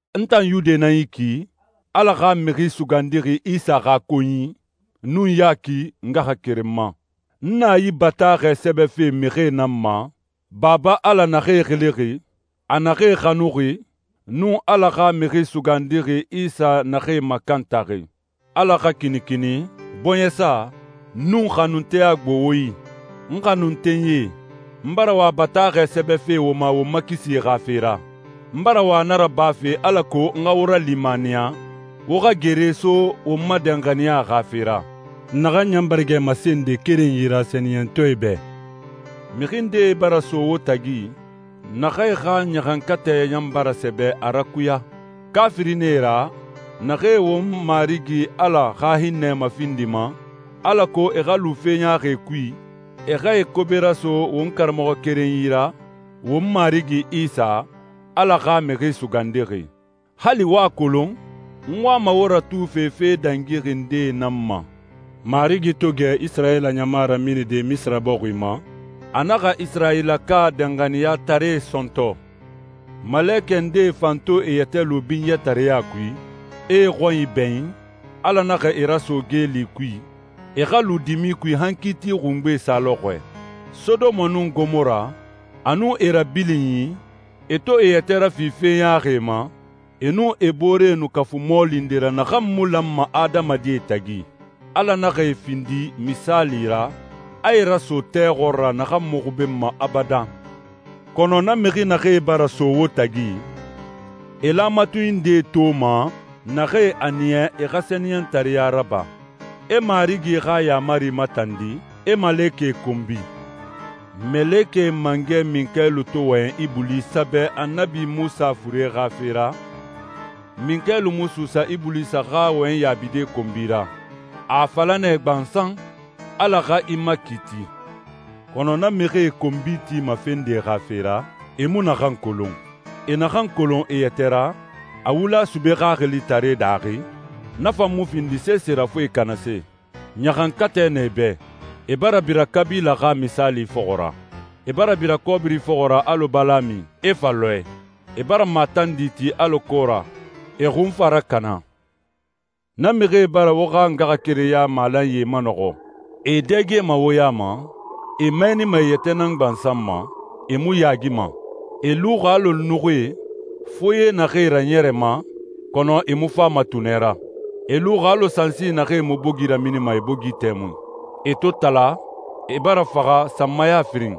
N tan Yude nan yi ki, Ala xa Mixi Sugandixi Isa xa konyi, nun Yaki ngaxakerenma. N na yi bataaxɛ sɛbɛfe mixie nan ma, Baba Ala naxee xilixi, a naxee xanuxi, nun Ala xa Mixi Sugandixi Isa naxee makantaxi. Ala xa kinikini, bɔɲɛsa, nun xanunteya gbo wo yi. N xanuntenyie, n bara wa bataaxɛ sɛbɛfe wo ma won ma kisi xa fe ra. N bara wa na rabafe alako n xa wo ralimaniya, wo xa gere so won ma danxaniya xa fe ra, naxan ɲan bara gɛ masende kerenyi ra sɛniyɛntɔɛe bɛ. Mixi ndee bara so wo tagi, naxee xa ɲaxankatɛ ɲan bara sɛbɛ a rakuya. Kaafirie nan e ra, naxee won Marigi Ala xa hinnɛ mafindima, alako e xa lu fe ɲaaxie kui, e xa e kobe raso won Karamɔxɔ kerenyi ra, won Marigi Isa, Ala xa Mixi Sugandixi. Hali wo a kolon, n wama wo ratufe fe dangixi ndee nan ma. Marigi to gɛ Isirayila ɲama raminide Misira bɔxi ma, a naxa Isirayilaka danxaniyataree sɔntɔ. Malekɛ ndee fan to e yɛtɛ lu binyɛtareɲa kui, e e xɔnyi bɛɲin, Ala naxa e raso geeli kui, e xa lu dimi kui han kiiti xungbe sa lɔxɔɛ. Sodoma nun Gomora, a nun e rabilinyi, e to e yɛtɛ rafi fe ɲaaxie ma, e nun e boore nu kafu mɔɔli nde ra naxan mu lanma adamadie tagi, Ala naxa e findi misaali ra, a e raso tɛ xɔɔra naxan mu xubenma abadan. Kɔnɔ na mixi naxee bara so wo tagi, e laamatunyi ndee toma naxee a niya e xa sɛniyɛntareɲa raba, e Marigi xa yaamari matandi, e malekɛe konbi. Malekɛ mangɛ Minkayilu to wɔyɛn Ibulisa bɛ Annabi Munsa fure xa fe ra, Minkayilu mu suusa Ibulisa xa wɔyɛnyi yaabide konbi ra. A a fala nɛ gbansan, «Ala xa i makiiti.» Kɔnɔ na mixie konbi tima fe nde xa fe ra, e mu naxan kolon. E naxan kolon e yɛtɛ ra, a wula sube xaxilitaree daaxi, na fan mu findi sese ra fo e kanase. Ɲaxankatɛ na e bɛ. E bara bira Kabila xa misaali fɔxɔ ra. E bara bira kɔbiri fɔxɔ ra alɔ Balami, e fa lɔɛ. E bara matandi ti alɔ Kora, e xun fa rakana. Na mixie bara wo xa ngaxakerenya malanyie manɔxɔ. E e dɛgema wo ya ma, e mɛɛnima e yɛtɛ nan gbansan ma, e mu yaagima. E luxi alɔ nuxuie, foye naxee raɲɛrɛma, kɔnɔ e mu fama tunɛ ra. E luxi alɔ sansi naxee mu bogi raminima e bogi tɛmui. E to tala, e bara faxa sanmaya firin.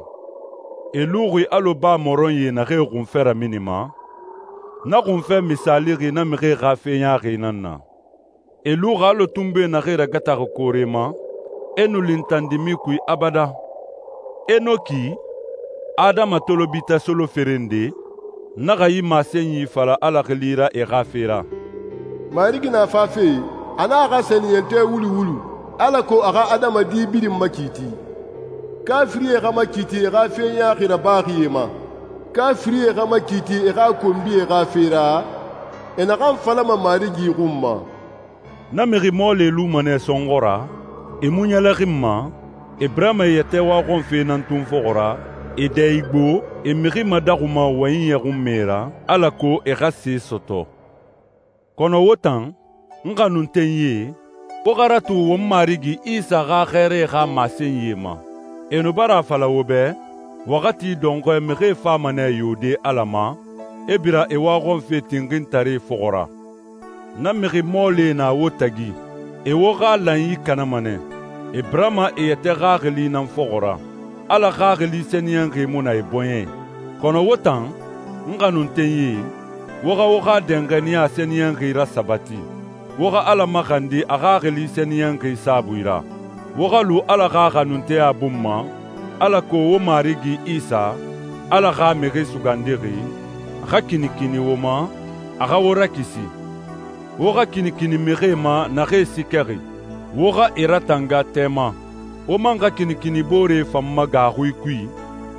E luxi alɔ baa mɔrɔnyie naxee xunfɛ raminima. Na xunfɛ misaalixi na mixie xa fe ɲaaxie nan na. E luxi alɔ tunbui naxee ragataxi koore ma, e nu lintan dimi kui abadan. Enoki, Adama tolobitɛ solofere nde, naxa yi masenyi fala Ala xili ra e xa fe ra, «Marigi na fafe, a nun a xa sɛniyɛntɔɛ wulu wulu, alako a xa adamadi birin makiiti. Kaafirie xa makiiti e xa fe ɲaaxi rabaxie ma. Kaafirie xa makiiti e xa konbie xa fe ra, e naxan falama Marigi xun ma.» Na mixi mɔɔlie luma nɛ sɔnxɔ ra, e mu ɲɛlɛxinma, e birama e yɛtɛ waxɔnfe nan tun fɔxɔ ra, e dɛ igbo, e mixi madaxuma wɔyɛnyi ɲɔxunmɛ ra alako e xa se sɔtɔ. Kɔnɔ wo tan, n xanuntenyie, wo xa ratu won Marigi Isa xa xɛɛrae xa masenyie ma. E nu bara a fala wo bɛ, «Waxati dɔnxɔɛ, mixie fama nɛ yode Ala ma, e bira e waxɔnfe tinxintaree fɔxɔ ra.» Na mixi mɔɔlie na wo tagi. E wo xa lanyi kanama nɛ. E birama e yɛtɛ xaxili nan fɔxɔ ra. Ala Xaxili Sɛniyɛnxi mu na e bɔɲɛ i. Kɔnɔ wo tan, n xanuntenyie, wo xa wo xa danxaniya sɛniyɛnxi rasabati. Wo xa Ala maxandi a Xaxili Sɛniyɛnxi saabui ra. Wo xa lu Ala xa xanunteya bun ma, alako wo Marigi Isa, Ala xa Mixi Sugandixi, xa kinikini wo ma, a xa wo rakisi. Wo xa kinikini mixie ma naxee siikɛxi, wo xa e ratanga tɛ ma. Wo man xa kinikini booree fan ma gaaxui kui,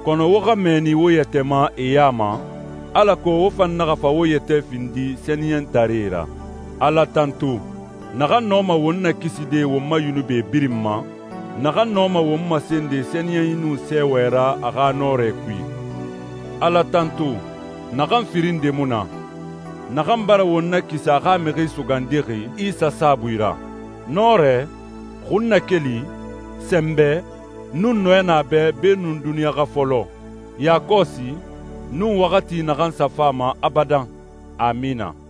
kɔnɔ wo xa mɛɛni wo yɛtɛ ma e ya ma, alako wo fan naxa fa wo yɛtɛ findi sɛniyɛntaree ra. Ala tantu, naxan nɔma won nakiside won ma yunubi birin ma, naxan nɔma won masende sɛniyɛnyi nun sɛɛwɛ ra a xa nɔrɛ kui. Ala tantu, naxan firin nde mu na, naxan bara won nakisi a xa Mixi Sugandixi Isa saabui ra. Nɔrɛ, xunnakeli, sɛnbɛ, nun nɔɛ na a bɛ beenun duniɲa xa fɔlɔ, yakɔsi, nun waxati naxan sa fama abadan. Amina.